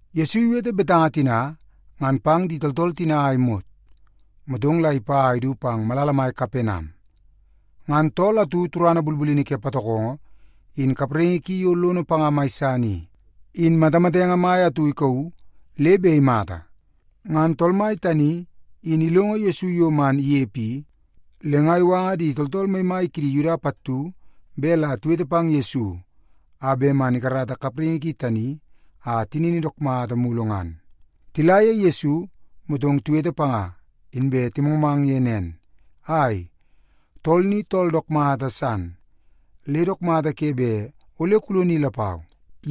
Yesu iwete betanga tina ngan pang di tooltool tina a imot, motong la ipa a idu pang malala mai Kapenam. Ngan tool atu turana bulbulini ke patokongo, in kapraingi ki yo lono panga mai san i, in matamatenge mai atu ikauu le bet imata. Ngan tool mai tani in ilongo Yesu yo man inepe i, le nga iwanga di tooltool maimai kidi Yuda pattu bet la tiwete pang Yesu a bet man ikarata kapraingi ki tani a tinini dook mata mulu ngan. Tila ye Yesu, motong tiwete panga, inbe timangmang ye nen, “Ai, tool ni tool dook mata san, le dook mata ke bet ole kuloni lapau,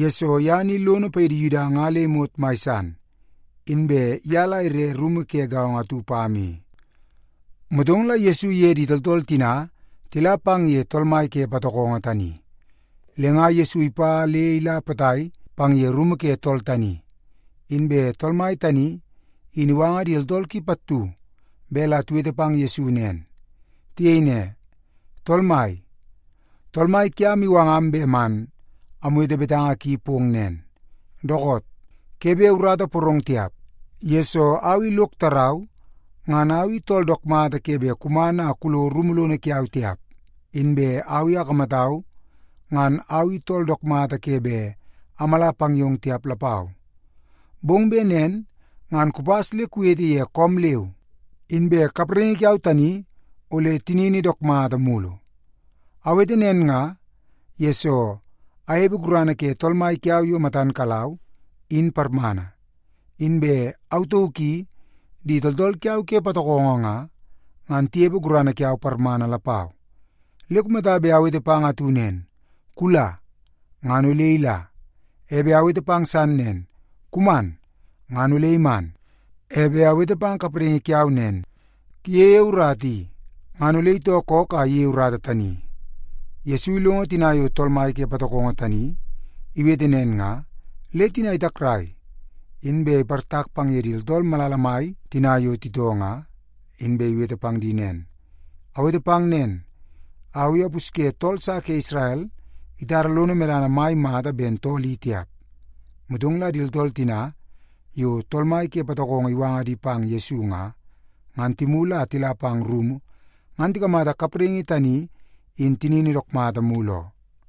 yesoo ye ni lono paidi Yuda nga le imot mai san, inbe ye la ire rumu ke gaongo atu pam i.” Motong la Yesu iye di tooltool tina tila pang ye tool mai ke patokongo tani. Le nga Yesu ipa le ila potai pang ye rumu ke tool tani, inbe tool mai tani, in iwanga di tooltool ki pattu bet la tiwete pang Yesu nen. Tiyei ne, “Tool Mai, tool mai kiam iwangam bet man amwete betanga ki pong nen, ‘Dookoot, ke bet urata iporong tiap, yesoo au i lok tarau ngan au i tool dook mata ke bet kuman a kulo rumu lono kiau tiap. Inbe au i akamatau ngan au tool dook mata ke bet amala pang yong tiap lapau. Bong bet nen ngan kupas le kuwete ye koom leu, inbe kapraingi kiau tani ole tinini dook mata mulu. Awete nen nga, yesoo anepe gurana ke tool mai kiau yo matan kalau, in parmana. Inbe au tauk i di tooltool kiau ke patokongo nga, ngan tinepe gurana kiau parmana lapau. Le kumata bet awete pang atu nen, “Kula,” ngan ole ila. E bet awete pang san nen, “Kuman,” ngan ole iman. E bet awete pang kapraingi kiau nen, “Kuyeie urata i,” ngan ole itoo kook a iyeie urata tani.’” Yesu ilongo tina yo tool mai ke patokongo tani iwete nen nga, le tina itakrai, inbe iportak pang ye di tooltool malala mai tina yo titoo nga, inbe iwete pang di nen, “Awete pang nen, au i apusye tool sa ke Isrel itara lono medana mai mata ben tool i tiap.” Motong la di tooltool tina yo tool mai ke patokongo iwanga di pang Yesu nga, ngan timulu a tila pang rumu ngan tikamata kapraingi ki tani in tinini dook mata mulu oo.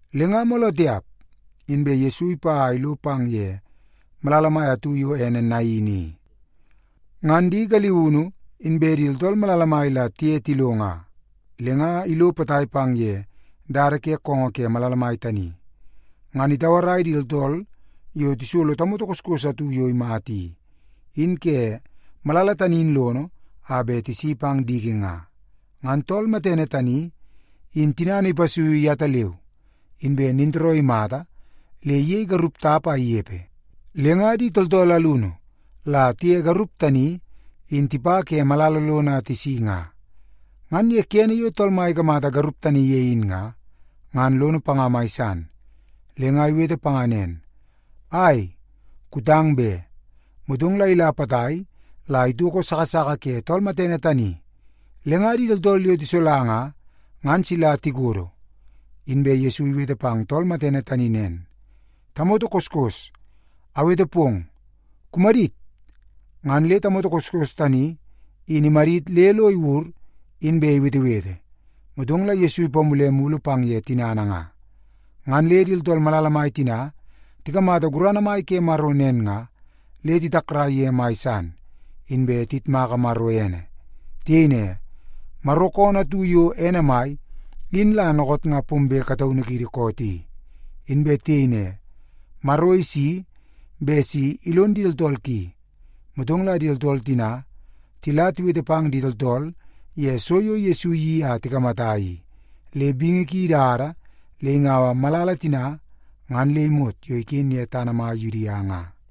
Le nga mooloo tiap inbe Yesu ipa a ilo pang ye malala mai atu yo ene Nain i. Ngan di galiunu inbe di tooltool malala mai la tiye tilo nga. Le nga ilo potai pang ye dada ke koongoo ke malala mai tani, ngan itauarai di tooltool yo tisolo tamoto koskos atu yo imata i, in ke malala tani in lono a bet tisi pang diki nga. Ngan tool matene tani, in tinana ipasuiu yetaleu, inbe nintooroo imata le iyei garup tap a inepe. Le nga di tooltool alunu la tiye garup tani in tipa ke malala lono a tisi nga. Ngan ye kene yo Tool Mai ikamata garup tani ye in nga, ngan lono panga mai san. Le nga iwete panga nen, “Ai, kutang be.” Motong la ila potai la itoko sasaka ke tool matene tani, le nga di tooltool yo tisola nga, ngan sila tikodo. Inbe Yesu iwete pang tool matene tani nen, “Tamoto koskos, awete pong, kumadit!” Ngan le tamoto koskos tani in imadit le lo iwur, inbe iwetewete. Motong la Yesu ipamule mulu pang ye tinana nga. Ngan le di tooltool malala mai tina tikamata gurana mai ke Maro nen nga, le titakrai ye mai san, inbe tiyitmaka Maro ene. Tiyei ne, “Maro koonoo atu yo ene mai in la dookoot nga pombe kataunu kiidi koot i.” Inbe tiyei ne, “Maro isi bet si ilon di tooltool ki.” Motong la di tooltool tina, tila tiwete pang di tooltool ye so yo Yesu iyeii a tikamata i, le bingi ki idada le ingau malala tina ngan le imot yo iken ye tana mai Yudia nga.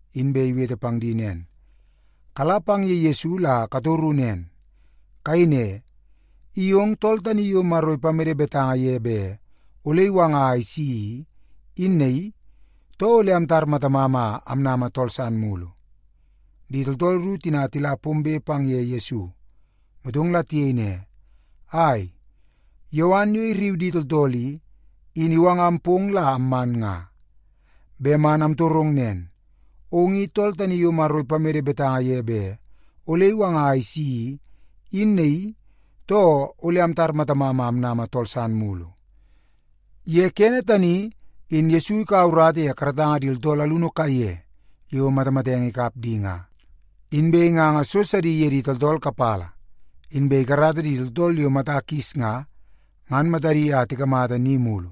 inbe iwete pang di nen, “Kala pang ye Yesu la katoru nen. Kayei ne, ‘I ong tool tani yo Maro ipamede betanga ye bet ole iwanga a isi i, in naii, too ole amtar matamam a amnama tool san mulu?’” Di tooltool ru tina tila pombe pang ye Yesu, motong la tiyei ne, “Ai, Yowan yo irriu di tooltool i, in iwangam pong la amman nga. Bet man amtorong nen, ong i tool tani yo Maro ipamede betanga ye bet ole iwanga a isi i, in naii, too ole amtar matamam a amnama tool san mulu?” Ye kene tani, in Yesu ikaua urata ye karatanga di tooltool alunu kaiye yo matamatenge ikap di nga. Inbe inganga so sidi ye di tooltool kapala, inbe ikarata di tooltool yo mata kis nga, ngan matadi a tikamata ni mulu.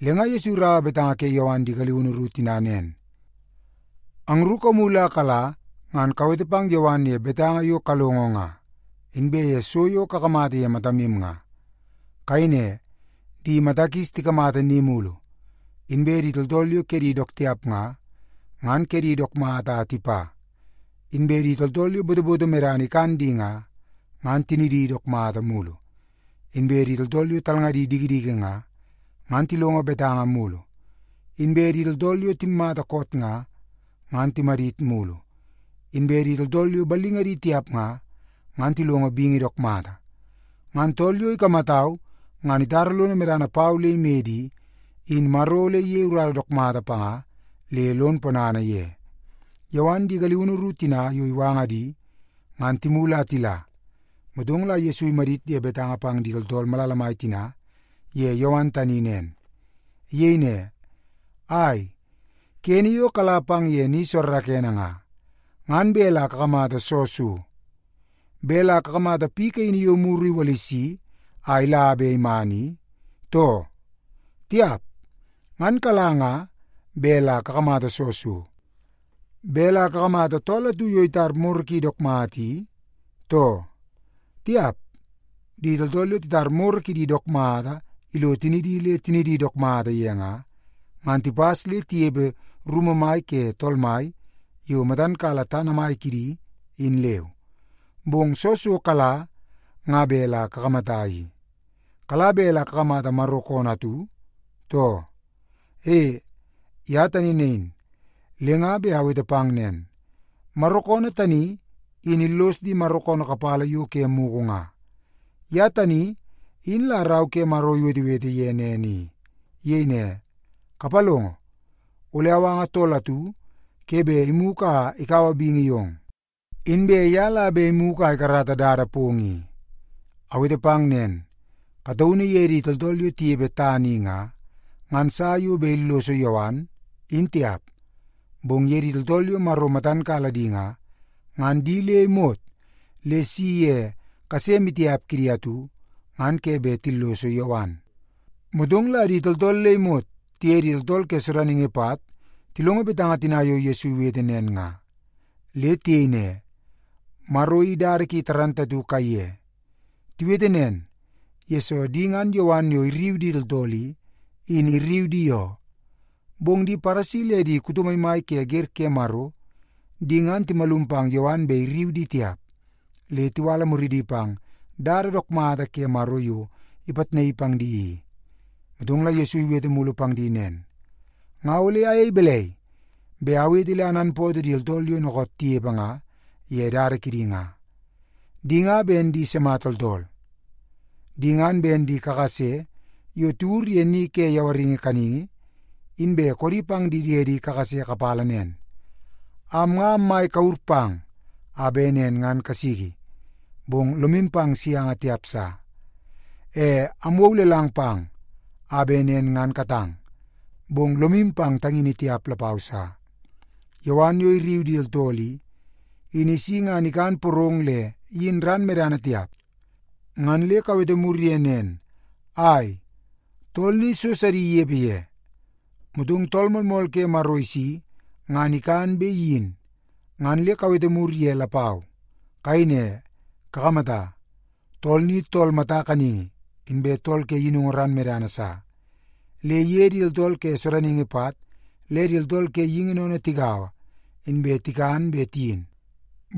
Le nga Yesu iraua betanga ke Yowan di galiunu ru tina nen, “Angru kamulu a kala ngan kawete pang Yowan ye betanga yo kalongo nga, inbe ye so yo kakamata ye matamu nga. Kayei ne, ‘Di mata kis tikamata ni mulu; inbe di tooltool yo kedi dook tiap nga, ngan kedi dook mata a tipa; inbe di tooltool yo botoboto medana ikan di nga, ngan tinidi dook mata mulu; inbe di tooltool yo talngadi dikidiki nga, ngan tilongo betanga mulu; inbe di tooltool yo timmata koot nga, ngan timadit mulu; inbe di tooltool yo ballingadi tiap nga, ngan tilongo bingi dook mata.’ Ngan tool yo ikamatau ngan itara lono medana pau le imede i, in Maro ole iyei urata dook mata panga le lon ponana ye.” Yowan di galiunu ru tina yo iwanga di, ngan timulu a tila, motong la Yesu imadit ye betanga pang di tooltool malala mai tina ye Yowan tani nen. Iyei ne, “Ai, kene yo kala pang ye ni soorookoonoo nga, ngan bet la kakamata soo so? Bet la kakamata piu kaini yo muru iwalisi a ila be iman i, too? Tiap. Ngan kala nga bet la kakamata soo so? Bet la kakamata tool atu yo itar moro ki dook mata i, too? Tiap. Di tooltool yo titar moro kidi dook mata ilo tinidi le tinidi dook mata ye nga, ngan tipas le tinepe rumu mai ke tool mai yo matan kala tana mai kidi, in leu. Bong soo so kala nga bet la kakamata i? Kala bet la kakamata Maro koonoo atu, too? E, ye tani nain. Le nga bet awete pang nen, Maro koonoo tani in illos di Maro koonoo kapala yo ke mugu nga. Ye tani in la Rau ke Maro iwetewete ye nen i. Iyei ne, ‘Kapalongo! Ole awanga tool atu ke bet imugu a ikaua bingi yong. Inbe ye la bet imugu a ikarata dada pong i.’ Awete pang nen, kataunu ye di tooltool yo tinepe tana i nga, ngan sa yo bet illoso Yowan, in tiap. Bong ye di tooltool yo Maro bet matan kala di nga, ngan di le imot le isi ye kase maitiap kidi atu, ngan ke bet tilloso Yowan.” Motong la di tooltool le imot tiye di tooltool ke sodaningi pat tilongo betanga tina yo Yesu iwete nen nga, le tiyei ne, “Maro in dada ki dook mata kaiye.” Tiwete nen, yesoo di ngan Yowan yo irriu di tooltool i, in irriu di oo. Bong di Paresi le di kuto maimai ke wer ke Maro, di ngan timalum pang Yowan bet irriu di tiap. Le tiwala muridi pang dada dook mata ke Maro yo ipitnaii pang di i. Motong la Yesu iwete mulu pang di nen, “Nga ole ayei balai bet awete le ananpootoo di tooltool yo dookoot tinepe nga ye dada kidi nga? Di nga ben di sima tooltool? Di ngan ben di kakase yo tiwur ye ni ke yawaringi kaningi, inbe koodi pang di diedi kakase kapala nen, ‘Am nga ammai kure pang a bet nen ngan kasiki, bong lomu pang sianga tiap sa. E amwou lelang pang a bet nen ngan katang, bong lomu pang tangini tiap lapau sa.’ Yowan yo irriu di tooltool i, in isi ngan ikan porong le iyin ran medana tiap. Ngan le kawete mur ye nen, ‘Ai, tool ni so sidi inepe ye.’ Motong Tool Moolmool ke Maro isi ngan ikan be iyin, ngan le kawete mur ye lapau. Kayei ne, ‘Kakamata, tool ni tool mata kaningi inbe tool ke yinungu ran medana sa. Le iye di tooltool ke sodaningi pat le di tooltool ke geingi sennene tigaua, inbe tikan be tiyin.’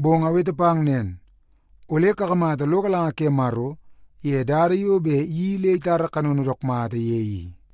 Bong awete pang nen, ole kakamata lo galanga ke Maro ye dada yo bet iyeii le itara kanono dook mata ye i.”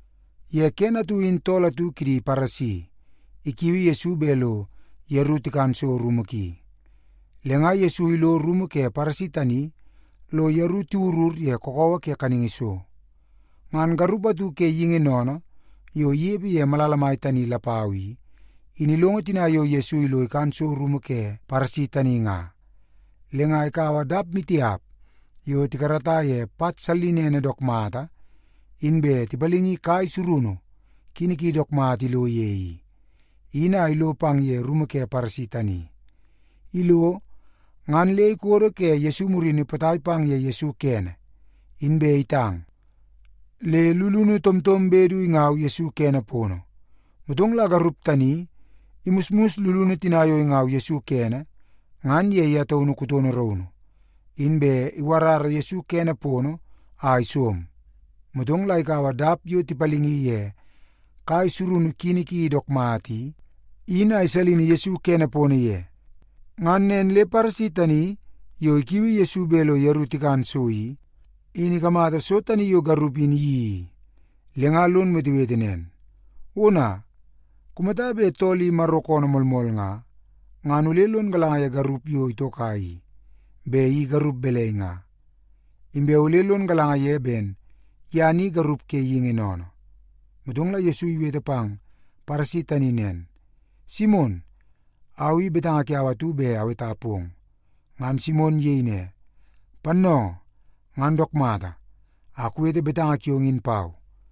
Ye kene atu in tool atu kidi Paresi ikiui Yesu bet lo yeru tikan so rumu ki. Le nga Yesu ilo rumu ke Paresi tani lo yeru tiwurur ye kakawa ke kaningi so. Ngan garup atu ke geingi sennene yo inepe ye malala mai tani lapau i, in ilongo tina yo Yesu ilo ikan so rumu ke Paresi tani nga. Le nga ikaua dap maitiap yo tikarata ye pat sallinene dook mata inbe tipalingi kai surunu kini ki dook mata ilo ye i, in a ilo pang ye rumu ke Paresi tani. Ilo, ngan le ikodo ke Yesu murini potai pang ye Yesu kene, inbe itang, le lulunu tomtombe du ingau Yesu kene. Motong la garup tani imusmus lulunu tina yo ingau Yesu kene, ngan ye ye taunu kutono raunu, inbe iwarara Yesu kene a isom. Motong la ikaua dap yo tipalingi ye kai surunu kini ki dook mata i, in a isalin Yesu kene ye. Ngan nen le Paresi tani yo ikiui Yesu bet lo yeru tikan so i, in ikamata so tani yo garup in iyeii i, le nga lon wetewete nen, “Ona, kumata bet tool i Maro koonoo moolmool nga, ngan ole lon galanga ye garup yo itoka i, bet i garup balai nga. Inbe ole lon galanga ye ben ye ni garup ke geingi sennene.” Motong la Yesu iwete pang Paresi tani nen, “Simon, au i betanga kiau atu bet aweta pong.” Ngan Simon iyei ne, “Pannoongoo, ngan dook mata, a kuwete betanga kiong in pau.”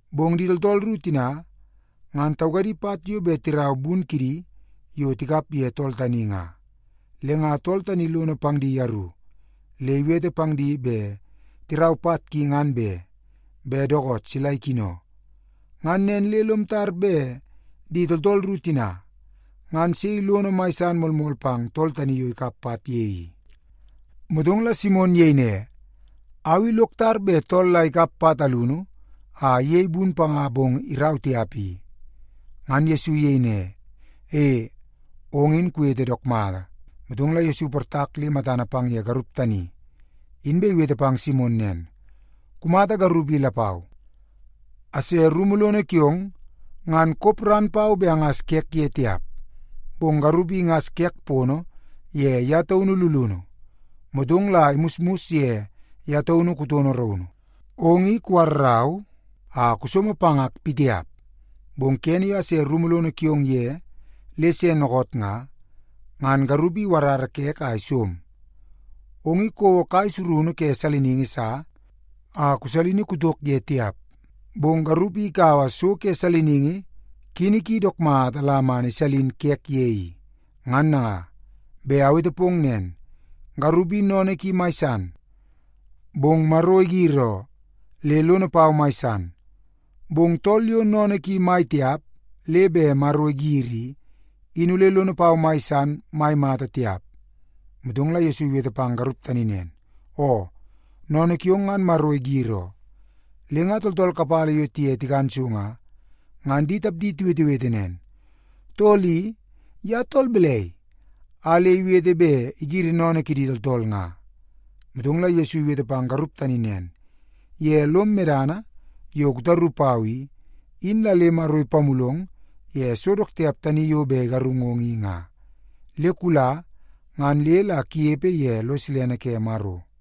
Bong di tooltool ru tina ngan taukadi pat yo bet tirau bun kidi yo tikap ye tool tani nga. Le nga tool tani lono pang di yeru, le iwete pang di bet tirau pat ki ngan be, bet dookoot sila ikino. Ngan nen le lom tar bet di tooltool ru tina, ngan sei lono mai san moolmool pang tool tani yo tikap pat ye i?” Motong la Simon iyei ne, “Au i lok tar bet tool la ikap pat alunu a iyei bun panga bong irau tiap i.” Ngan Yesu iyei ne, “E, ong in kuwete dook mata.” Motong la Yesu iportak le matana pang ye garup tani, inbe iwete pang Simon nen, “Kumata garup i lapau? Ase rumu lono kiong, ngan kop ran pau bet angas kek ye tiap. Bong garup i ingas kek pono ye ye taunu lulunu, motong la imusmus ye ye taunu kutono raunu. Ong i kuwarrau a kusomo pangak pitiap. Bong kene yo ase rumu lono kiong ye le se dookoot nga, ngan garup i iwarara kek a isom. Ong i kouo kai surunu ke saliningi sa a kusalini kutok ye tiap, bong garup i ikaua so ke saliningi kini ki dook mata la man isalin kek ye i. Ngan nanga, bet awete pong nen, garup i sennene ki mai san, bong Maro igir oo, le lono pau mai san. Bong tool yo sennene ki mai tiap le bet Maro igiri i, in ole lono pau mai san mai mata tiap.” Motong la Yesu iwete pang garup tani nen, “Oo, sennene kiong ngan Maro igir oo.” Le nga tooltool kapala yo tiye tikan so nga, ngan di tapdi tiwetewete nen, “Tool i, ye tool balai a le iwete bet igiri sennene kidi tooltool nga?” Motong la Yesu iwete pang garup tani nen, “Ye lom medana yo kutaru pau i, in la le Maro ipamulong ye so dook tiap tani yo bet igarungong i. Le kula ngan le la kunepe ye lo silene ke Maro.”